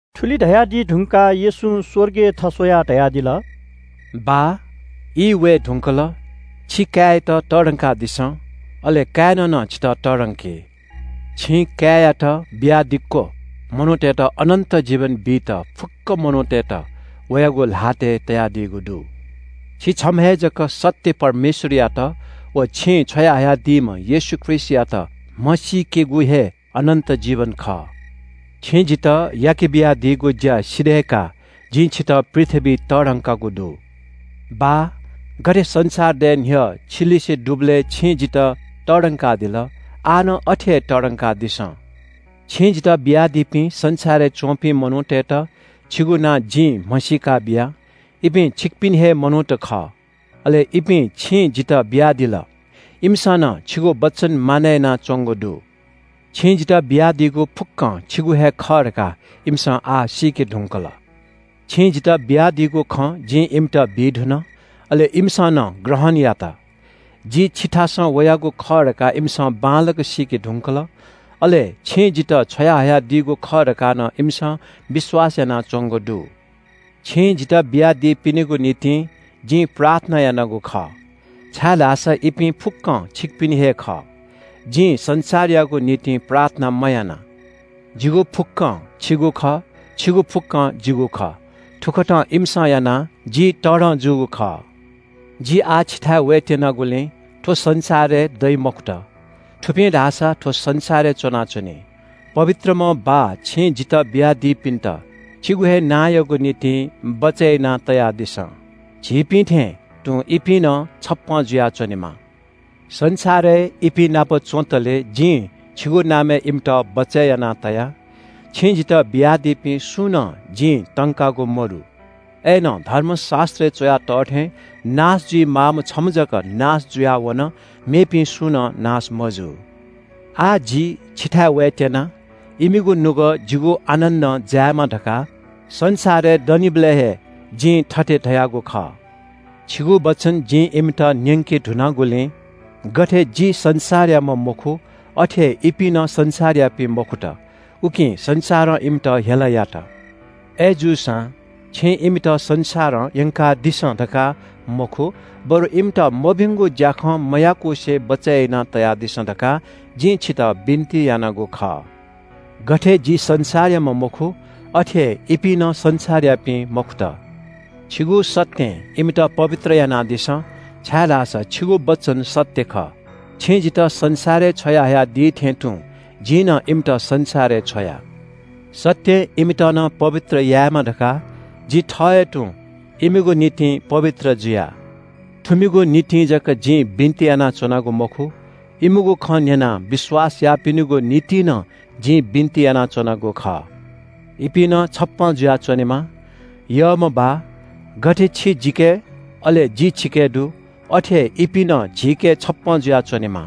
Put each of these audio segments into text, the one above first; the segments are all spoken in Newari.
थुलि धयादी धुंकाः येशूं स्‍वर्गय् थस्‍वयाः धयादिल – “बाः, ई वये धुंकल, छि काय्‌यात तःधंकादिसँ, अले काय्‌नं नं छितः तःधंकी। छिं काय्‌यात बियादिक्‍व मनूतय्‌त अनन्‍त जीवन बीत फुक्‍क मनूतय्‌त वयागु ल्‍हातय् तयादीगु दु। छि छम्‍ह हे जक सत्‍य परमेश्‍वरयात व छिं छ्वयाहयादीम्‍ह येशू ख्रीष्‍टयात म्‍हसीकेगु हे अनन्‍त जीवन खः। छिं जितः याके बियादीगु ज्‍या सिधय्‌काः जिं छितः पृथ्‍वीइ तःधंकागु दु। बाः, गथे संसार दये न्‍ह्यः छिलिसे दुबलय् छिं जितः तःधंकादिल, आः नं अथे हे तःधंकादिसँ।” “छिं जितः बियादीपिं संसारय् च्‍वंपिं मनूतय्‌त छिगु नां जिं म्‍हसीका बिया। इपिं छिकपिनि हे मनूत खः, अले इपिं छिं जितः बियादिल। इमिसं नं छिगु वचन मानय् यानाच्‍वंगु दु। छिं जितः बियादीगु फुक्‍कं छिगु हे खः धकाः इमिसं आः सीके धुंकल। छिं जितः बियादीगु खँ जिं इमित बी धुन। अले इमिसं नं ग्रहण यात। जि छिथासं वयागु खः धकाः इमिसं बांलाक सीके धुंकल, अले छिं जितः छ्वयाहयादीगु खः धकाः नं इमिसं विश्‍वास यानाच्‍वंगु दु। “छिं जितः बियादीपिनिगु निंतिं जिं प्रार्थना यानागु खः, छाय्‌धाःसा इपिं फुक्‍कं छिकपिनि हे खः। जिं संसारयागु निंतिं प्रार्थना मयाना। जिगु फुक्‍कं छिगु खः, छिगु फुक्‍कं जिगु खः। थुकथं इमिसं यानाः जि तःधं जूगु खः। जि आः छिथाय् वयेत्‍यनागुलिं थ्‍व संसारय् दइ मखुत, थुपिं धाःसा थ्‍व संसारय् च्‍वनाच्‍वनी। पवित्रम्‍ह बाः, छिं जितः बियादीपिन्‍त छिगु हे नांयागु निंतिं बचय् यानातयादिसँ। झीपिं थें तुं इपिं नं छप्‍पँ जुयाच्‍वनेमा। संसारय् इपिं नाप च्‍वंतले जिं छिगु नामय् इमित बचय् याना तया। छिं जितः बियादीपिं सुं नं जिं तंकागु मदु। अय्‌नं धर्मशास्‍त्रय् च्‍वया तः थें नाश जुइमाःम्‍ह छम्‍ह जक नाश जुयावन, मेपिं सुं नं नाश मजू। “आः जि छिथाय् वयेत्‍यना। इमिगु नुगः जिगु आनन्‍दं जायेमा धकाः संसारय् दनिबलय् हे जिं थथे धयागु खः। छिगु वचन जिं इमित न्‍यंके धुनागुलिं गथे जि संसारयाम्‍ह मखु, अथे हे इपिं नं संसारयापिं मखुत, उकिं संसारं इमित हेला यात। अय्‌जूसां छिं इमित संसारं यंकादिसँ धकाः मखु बरु इमित मभिंगु ज्‍याखँ मयाकुसे बचय् यानातयादिसँ धकाः जिं छितः बिन्‍ति यानागु खः। गथे जि संसारयाम्‍ह मखु, अथे हे इपिं नं संसारयापिं मखुत। छिगु सत्‍यं इमित पवित्र यानादिसँ, छाय्‌धाःसा छिगु वचन सत्‍य खः। छिं जितः संसारय् छ्वया हयादीथें तुं जिं नं इमित संसारय् छ्वया। सत्‍यं इमित नं पवित्र यायेमा धकाः जि थः हे तुं इमिगु निंतिं पवित्र जुया।” “थुमिगु निंतिं जक जिं बिन्‍ति यानाच्‍वनागु मखु, इमिगु खँ न्‍यनाः विश्‍वास याःपिनिगु निंतिं नं जिं बिन्‍ति यानाच्‍वनागु खः। इपिं नं छप्‍पँ जुयाच्‍वनेमा। यःम्‍ह बाः, गथे छि जिके, अले जि छिके दु, अथे हे इपिं नं झीके छप्‍पँ जुयाच्‍वनेमा।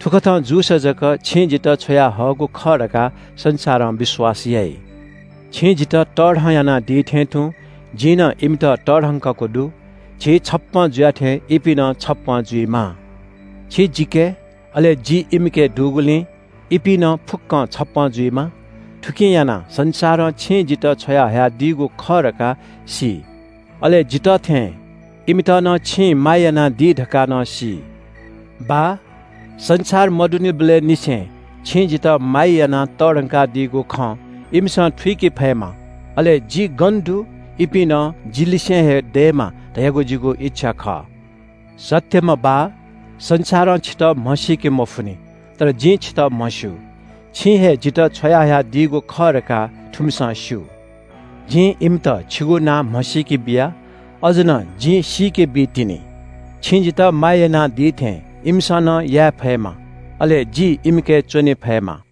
थुकथं जूसा जक छिं जितः छ्वयाहःगु खः धकाः संसारं विश्‍वास याइ। “छिं जितः तःधं यानादी थें तुं जिं नं इमित तःधंकागु दु। झी छप्‍पँ जुया थें इपिं नं छप्‍पँ जुइमा। छि जिके, अले जि इमिके दुगुलिं इपिं नं फुक्‍क छप्‍पँ जुइमा। थुकिं यानाः संसारं छिं जितः छ्वयाहयादीगु खः धकाः सी, अले जितः थें इमित नं छिं माया यानादी धकाः नं सी।” “बाः, संसार मदुनिबलय् निसें छिं जितः माया यानाः तःधंकादीगु खँ इमिसं थुइके फयेमा, अले जि गन दु, इपिं नं जि लिसे हे दयेमा धयागु जिगु इच्‍छा खः। “सत्‍यम्‍ह बाः, संसारं छितः म्‍हसीके मफुनि। तर जिं छितः म्‍हस्‍यू। छिं हे जितः छ्वयाहयादीगु खः धकाः थुमिसं स्‍यू। जिं इमित छिगु नां म्‍हसीके बिया। अझ नं जिं सीके बीतिनि। छिं जितः माया यानादी थें इमिसं नं याये फयेमा, अले जि इमिके च्‍वने फयेमा।”